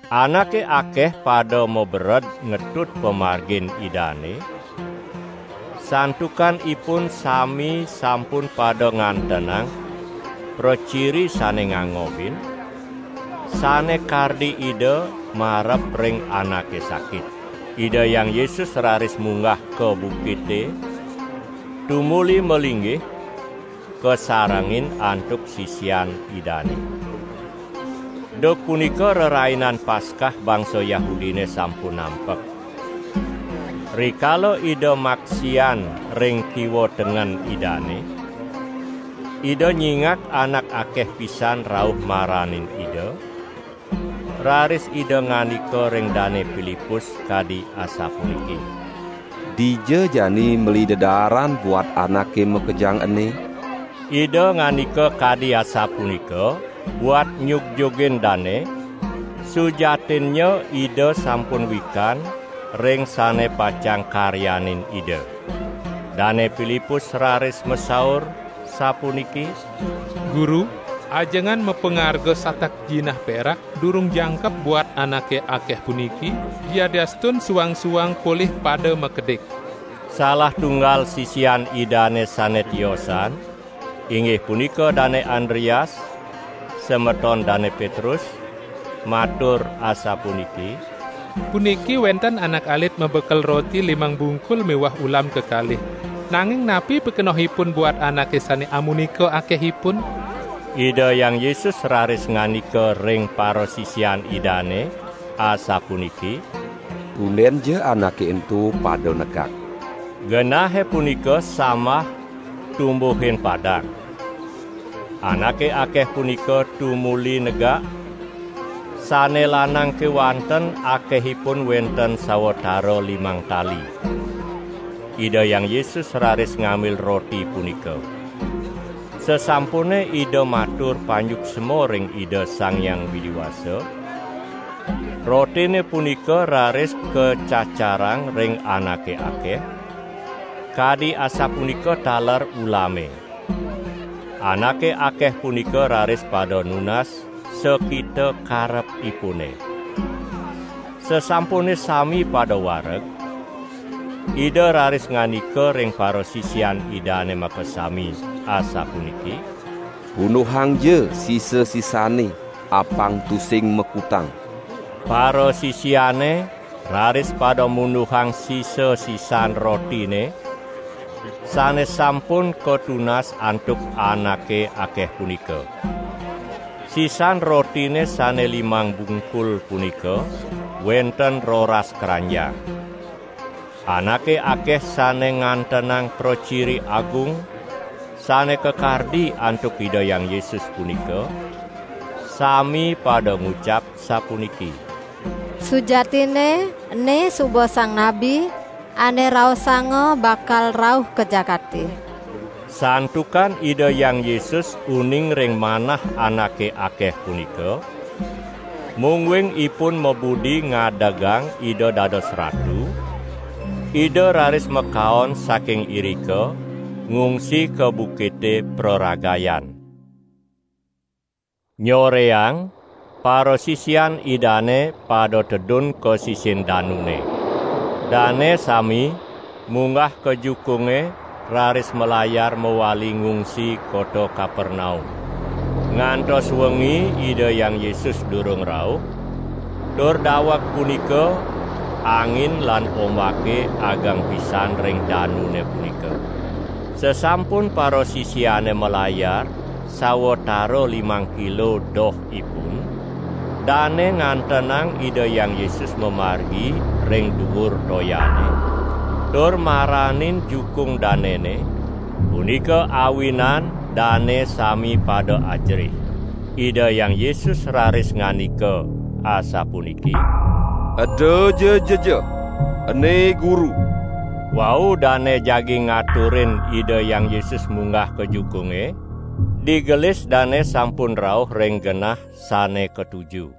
Anake akeh pada mabered ngetut pamargin Idane, santukan ipun sami sampun pada ngantenang praciri sane ngangobin, sane kardi Ida marep ring anake sakit. Ida Hyang Yesus raris munggah ka bukite tumuli malinggih, kasarengin antuk sisian Idane. Duk punika Rerainan Paskah bangsa Yahudine sampun nampek. Rikala Ida maksian ring kiwa tengen Idane, Ida nyingak anak akeh pisan rauh maranin Ida, raris Ida ngandika ring Dane Pilipus kadi asapuniki: "Dija jani meli dedaaran buat anake makejang ene?" ( Ida ngandika kadi asapunika buat nyugjugin dane; sujatinnya Ida sampun wikan ring sane pacang karyanin Ida.) Dane Pilipus raris masaur sapuniki: "Guru, ajengan mapangarga satak jinah perak durung jangkep buat anake akeh puniki, yadiastun suang-suang polih pada makidik." Salah tunggal sisian Idane sane tiosan, inggih punika Dane Andreas, semeton Dane Petrus, matur asapuniki: "Puniki wenten anak alit mabekel roti limang bungkul miwah ulam kekalih. Nanging napi pikenohipun buat anake sane amunika akehipun?" Ida Hyang Yesus raris ngandika ring parasisian Idane asapuniki: "Tundenja anake ento pada negak." (Genahe punika samah tumbuhin padang.) Anake akeh punika tumuli negak, sane lanang kewanten akehipun wenten sawatara limang tali. Ida Hyang Yesus raris ngambil roti punika. Sasampune Ida matur panyuksma ring Ida Sang Hyang Widi Wasa rotine punika raris kacacarang ring anake akeh, kadi asapunika taler ulame. Anake akeh punika raris pada nunas sakita karepipune. Sasampune sami pada wareg, Ida raris ngandika ring parasisian Idane makasami asapuniki: "Punduhangja sisa-sisanne apang tusing makutang." Parasisiane raris pada munduhang sisa-sisan rotine sane sampun katunas antuk anake akeh punika. Sisan rotine sane limang bungkul punika wenten roras kranjang. Anake akeh sane ngantenang praciri agung sane kakardi antuk Ida Hyang Yesus punika, sami pada ngucap sapuniki: "Sujatinne ene suba Sang Nabi, ane raosanga bakal rauh ka jagate!" Santukan Ida Hyang Yesus uning ring manah anake akeh punika, mungguing ipun mabudi ngadegang Ida dados ratu, Ida raris makaon saking irika ngungsi ka bukite praragayan. Nyoreang parasisian Idane pada tedun ka sisin danune. Dane sami munggah ka jukunge raris malayar mawali ngungsi kota Kapernaum. Ngantos wengi Ida Hyang Yesus durung rauh, tur daweg punika angin lan ombake ageng pisan ring danune punika. Sasampun parasisiane malayar sawatara limang kilo dohipun, dane ngantenang Ida Hyang Yesus mamargi ring duur toyane, tur maranin jukung danene, punika awinan dane sami pada ajerih. Ida Hyang Yesus raris ngandika asapuniki: "Edaja jejeh; ene Guru!" Wau dane jagi ngaturin Ida Hyang Yesus munggah ka jukunge, digelis dane sampun rauh ring genah sane katuju.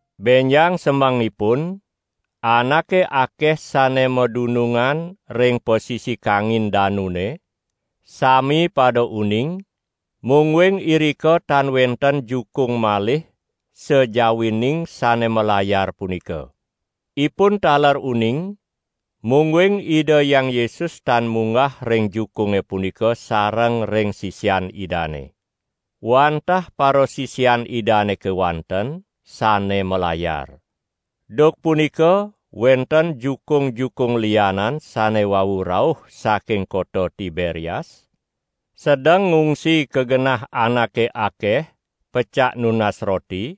Benjang semengipun anake akeh sane madunungan ring pasisi kangin danune, sami pada uning, mungguing irika tan wenten jukung malih sajawining sane malayar punika. Ipun taler uning, mungguing Ida Hyang Yesus tan munggah ring jukunge punika sareng ring sisian Idane. Wantah parasisian Idane kewanten sane malayar. Duk punika wenten jukung-jukung lianan sane wau rauh saking kota Tiberias, sedeng ngungsi ka genah anake akeh pecak nunas roti,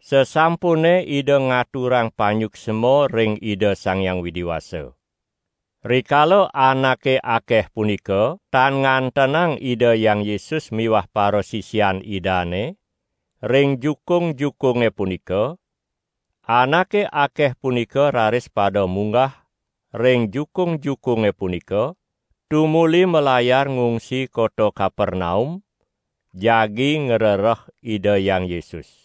sasampune Ida ngaturang panyuksma ring Ida Sang Hyang Widi Wasa. Rikala anake akeh punika tan ngantenang Ida Hyang Yesus miwah parasisian Idane ring jukung-jukunge punika, anake akeh punika raris pada munggah ring jukung-jukunge punika, tumuli malayar ngungsi kota Kapernaum jagi ngrereh Ida Hyang Yesus.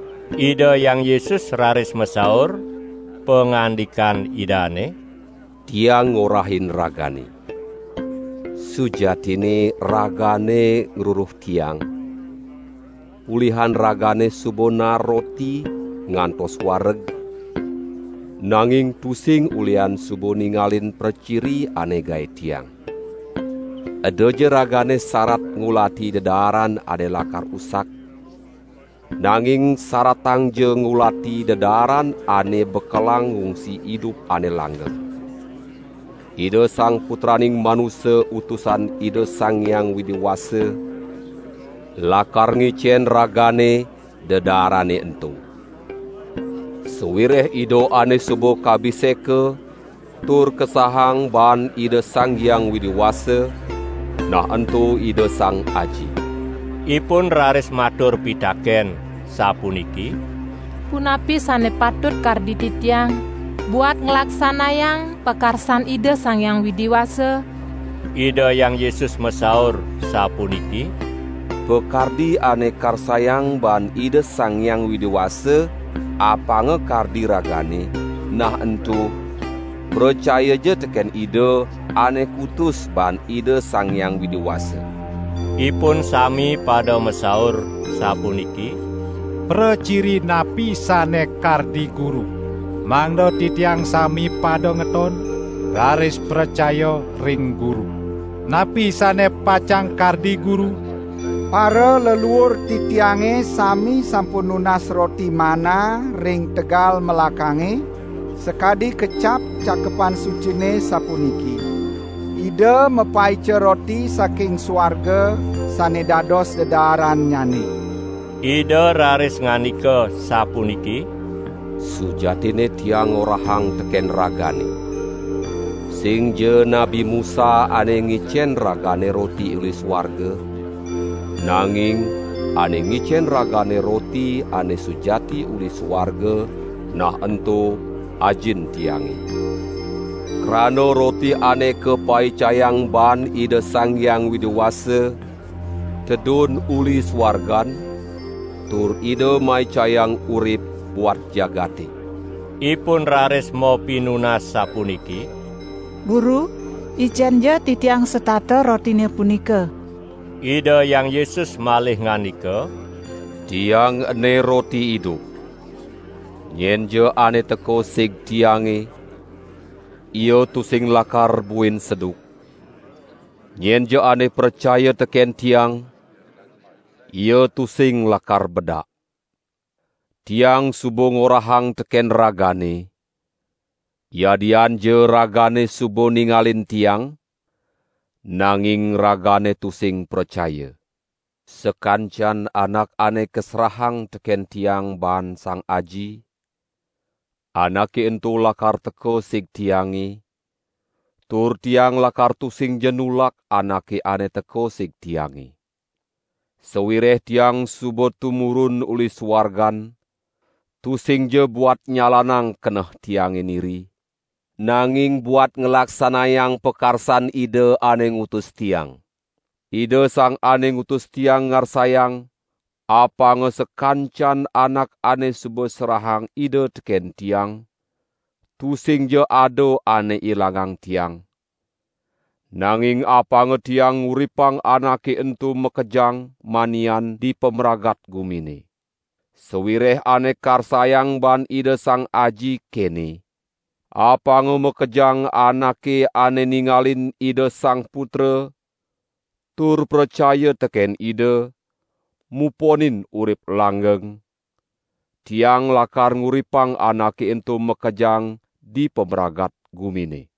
Ida Hyang Yesus raris masaur, pangandikan Idane: "Tiang ngorahin ragane, sujatinne ragane ngruruh Tiang, ulihan ragane suba naar roti ngantos wareg, nanging tusing ulihan suba ningalin praciri ane gae Tiang. Edaja ragane sarat ngulati dedaaran ane lakar usak; nanging saratangja ngulati dedaaran ane bekelang ngungsi idup ane langgeng. Ida Sang Putraning Manusa Utusan Ida Sang Hyang Widi Wasa lakar ngicen ragane dedaarane ento. Sawireh Ida ane suba kabiseka tur kasahang baan Ida Sang Hyang Widi Wasa, nah ento Ida Sang Aji." Ipun raris matur pitaken sapuniki: "Punapi sane patut kardi titiang, buat nglaksanayang pakarsan Ida Sang Hyang Widi Wasa?" Ida Hyang Yesus masaur sapuniki: "Pakardi ane karsayang baan Ida Sang Hyang Widi Wasa, apanga kardi ragane, nah ento: Pracayaja teken Ida, ane kutus baan Ida Sang Hyang Widi Wasa." Ipun sami pada masaur sapuniki: "Praciri napi sane kardi Guru, mangda titiang sami pada ngeton, raris pracaya ring Guru? Napi sane pacang kardi Guru? Paraleluur titiange sami sampun nunas roti manna ring tegal melakange, sakadi kecap Cakepan Sucine sapuniki: 'Ida mapaica roti saking suarga sane dados dedaarannyane!' " Ida raris ngandika sapuniki: "Sujatinne Tiang ngorahang teken ragane: Singja Nabi Musa ane ngicen ragane roti uli suarga, nanging ane ngicen ragane roti ane sujati uli suarga, nah ento Ajin Tiange. Krana roti ane kapaicayang baan Ida Sang Hyang Widi Wasa, tedun uli suargan tur Ida maicayang urip buat jagate." Ipun raris mapinunas sapuniki: "Guru, icenja titiang setata rotine punika!" Ida Hyang Yesus malih ngandika: "Tiang ene roti idup! Nyenja ane teka sig Tiange ia tusing lakar buin seduk; nyenja ane pracaya teken Tiang ia tusing lakar bedak. Tiang suba ngorahang teken ragane, yadianja ragane suba ningalin Tiang, nanging ragane tusing pracaya. Sakancan anak ane kaserahang teken Tiang baan Sang Aji, anake ento lakar teka sig Tiange tur Tiang lakar tusingja nulak anake ane teka sig Tiange. Sawireh Tiang suba tumurun uli suargan tusingja buat nyalanang keneh Tiang niri, nanging buat nglaksanayang pakarsan Ida ane ngutus Tiang. Ida Sang Ane Ngutus Tiang ngarsayang apanga sakancan anak ane suba serahang Ida teken Tiang, tusingja ada ane ilangang Tiang, nanging apanga Tiang nguripang anake ento makejang manian dipamragat gumine. Sawireh ane karsayang baan Ida Sang Aji kene: Apanga makejang anake ane ningalin Ida Sang Putra tur pracaya teken Ida, muponin urip langgeng; Tiang lakar nguripang anake ento makejang dipamragat gumine!"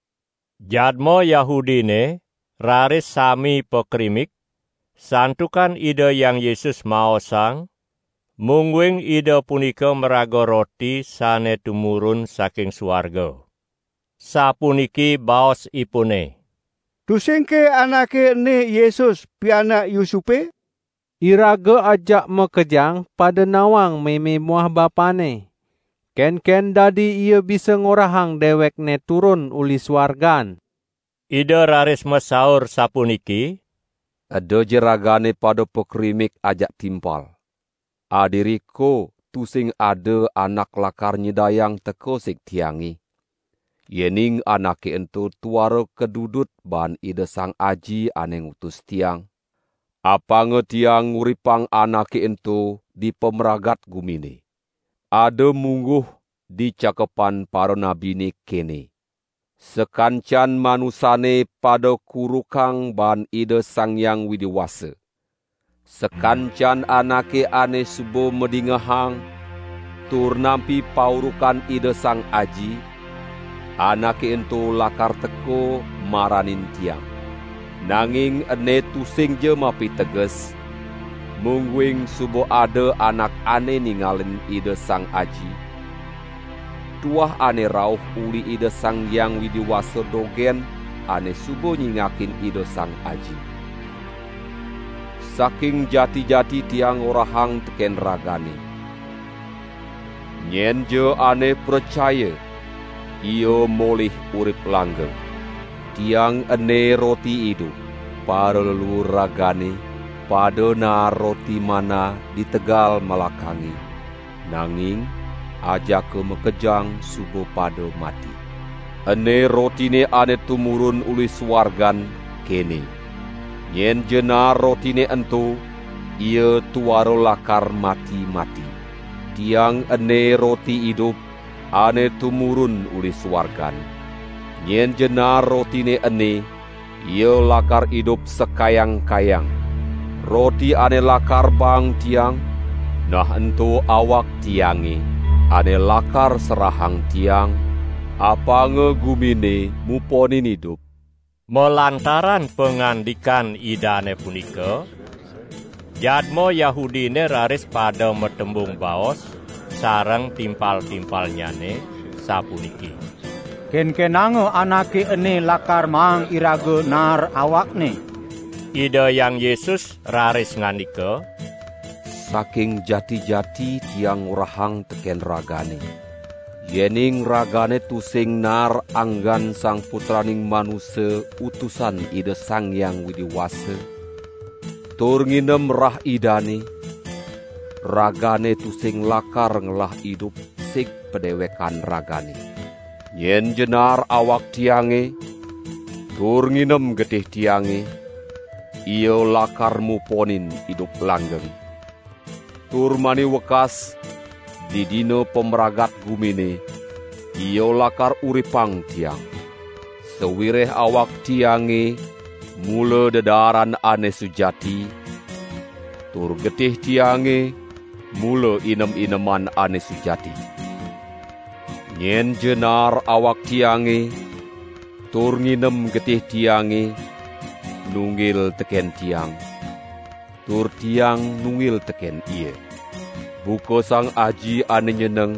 Jadma Yahudine raris sami pakrimik, santukan Ida Hyang Yesus maosang, mungguing Ida punika maraga roti sane tumurun saking suarga. Sapuniki baosipune: "Tusingke anake ene Yesus, pianak Yusupe? Iraga ajak makejang pada nawang meme muah bapanNe. Kenken dadi Ia bisa ngorahang dewekNe turun uli suargan?" Ida raris masaur sapuniki: "Edaja ragane pada pakrimik ajak timpal! Adiriko tusing ada anak lakar nyidayang teka sig Tiange, yening anake ento tuara kadudut baan Ida Sang Aji ane ngutus Tiang; apanga Tiang nguripang anake ento dipamragat gumine. Ada mungguh di Cakepan Paranabine kene: 'Sakancan manusane pada kurukang baan Ida Sang Hyang Widi Wasa.' Sakancan anake ane suba madingehang tur nampi paurukan Ida Sang Aji, anake ento lakar teka maranin Tiang. Nanging ene tusingja mapiteges, mungguing suba ada anak ane ningalin Ida Sang Aji; tuah ane rauh uli Ida Sang Hyang Widi Wasa dogen ane suba nyingakin Ida Sang Aji. Saking jati-jati Tiang ngorahang teken ragane: Nyenja ane pracaya ia molih urip langgeng. Tiang ene roti idup. Paraleluur ragane pada naar roti manna di tegal melakange, nanging ajaka makejang suba pada mati. Ene rotine ane tumurun uli suargan kene: Nyenja naar rotine ento, ia tuara lakar mati-mati. Tiang ene roti idup ane tumurun uli suargan; nyenja naar rotine ene, ia lakar idup sakayang-kayang. Roti ane lakar baang Tiang, nah ento awak Tiange, ane lakar serahang Tiang, apanga gumine muponin idup." Malantaran pangandikan Idane punika jadma Yahudine raris pada matembung baos sareng timpal-timpalnyane sapuniki: "Kenkenanga Anake ene lakar maang iraga naar awakne?" Ida Hyang Yesus raris ngandika: "Saking jati-jati Tiang ngorahang teken ragane: yening ragane tusing naar anggan Sang Putraning Manusa Utusan Ida Sang Hyang Widi Wasa, tur nginem rah Idane, ragane tusing lakar ngelah idup sig padewekan ragane. Nyenja naar awak Tiange tur nginem getih Tiange ia lakar muponin idup langgeng, tur mani wekas didina pamragat gumine ia lakar uripang Tiang. Sawireh awak Tiange mula dedaaran ane sujati tur getih Tiange mula inem-ineman ane sujati. Nyenja naar awak Tiange tur nginem getih Tiange, nunggil teken Tiang, tur Tiang nunggil teken ia. Buka Sang Aji ane nyeneng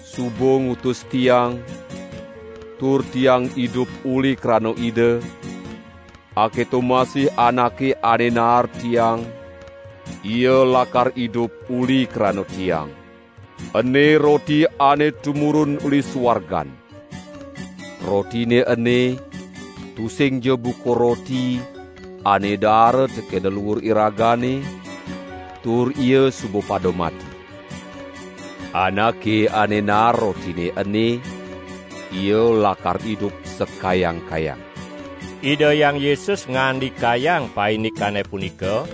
suba ngutus Tiang, tur Tiang idup uli krana Ida, aketo masih anake ane naar Tiang, ia lakar idup uli krana Tiang. Ene roti ane tumurun uli suargan; rotine ene tusingja buka roti ane daara teken leluur iragane, tur ia suba pada mati. Anake ane naar rotine ene ia lakar idup sakayang-kayang." Ida Hyang Yesus ngandikayang paindikane punika,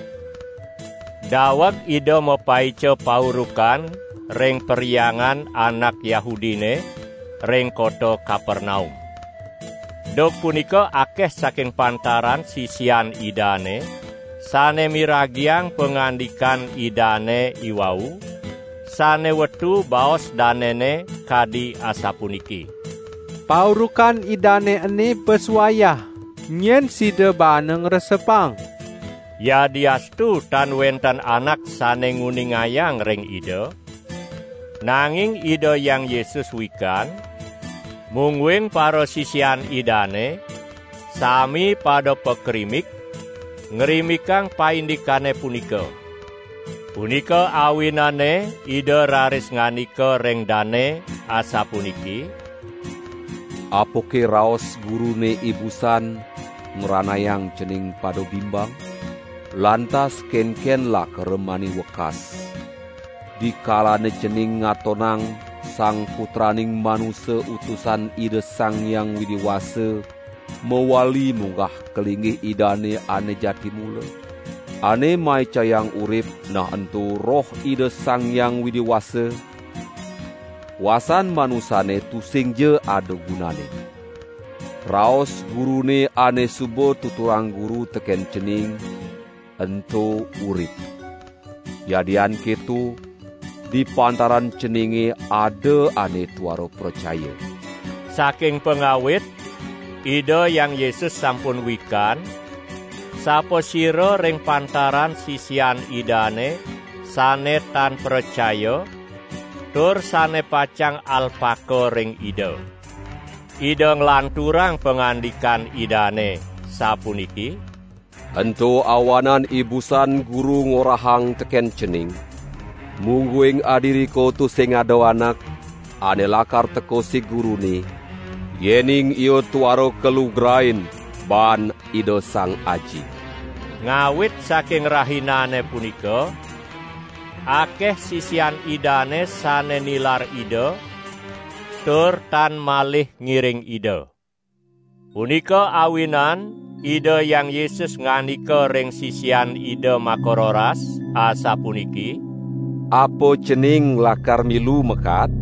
daweg Ida mapaica paurukan ring perhyangan anak Yahudine ring kota Kapernaum. Duk punika akeh saking pantaran sisian Idane sane miragiang pangandikan Idane iwau, sane wetu baos danene kadi asapuniki: "Paurukan Idane ene bes wayah, nyen sida baana ngresepang!" Yadiastu tan wenten anak sane nguningayang ring Ida, nanging Ida Hyang Yesus wikan, mungguing parasisian Idane sami pada pakrimik ngrimikang paindikane punika. Punika awinane Ida raris ngandika ring dane asapuniki: "Apake raos Gurune ibusan ngranayang cening pada bimbang? Lantas kenken lakara mani wekas dikalane cening ngatonang Sang Putraning Manusa Utusan Ida Sang Hyang Widi Wasa mawali munggah ka linggih Idane ane jati mula? Ane maicayang urip nah ento Roh Ida Sang Hyang Widi Wasa; kuasan manusane tusingja ada gunanne. Raos Gurune ane suba tuturang Guru teken cening, ento urip. Yadian keto, di pantaran ceninge ada ane tuara pracaya!" (Saking pangawit Ida Hyang Yesus sampun wikan sapasira ring pantaran sisian Idane sane tan pracaya tur sane pacang alpaka ring Ida.) Ida nglanturang pangandikan Idane sapuniki: "Ento awanan ibusan Guru ngorahang teken cening: Mungguing adiriko tusing ada anak ane lakar teka sig Gurune, yening ia tuara kalugrain baan Ida Sang Aji!" Ngawit saking rahinane punika akeh sisian Idane sane nilar Ida tur tan malih ngiring Ida. Punika awinan Ida Hyang Yesus ngandika ring sisian Ida makaroras asapuniki: "Apa cening lakar milu makaad?"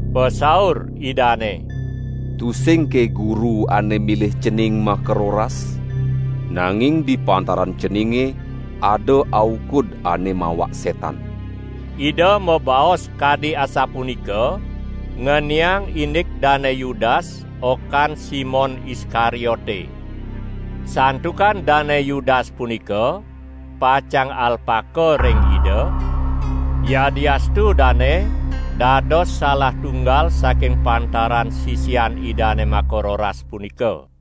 Pasaur Idane: "Tusingke Guru ane milih cening makaroras? Nanging di pantaran ceninge ada aukud ane mawak setan!" Ida mabaos kadi asapunika ngeniang indik Dane Yudas okan Simon Iskariote. Santukan Dane Yudas punika pacang alpaka ring Ida, yadiastu dane dados salah tunggal saking pantaran sisian Idane makaroras punika.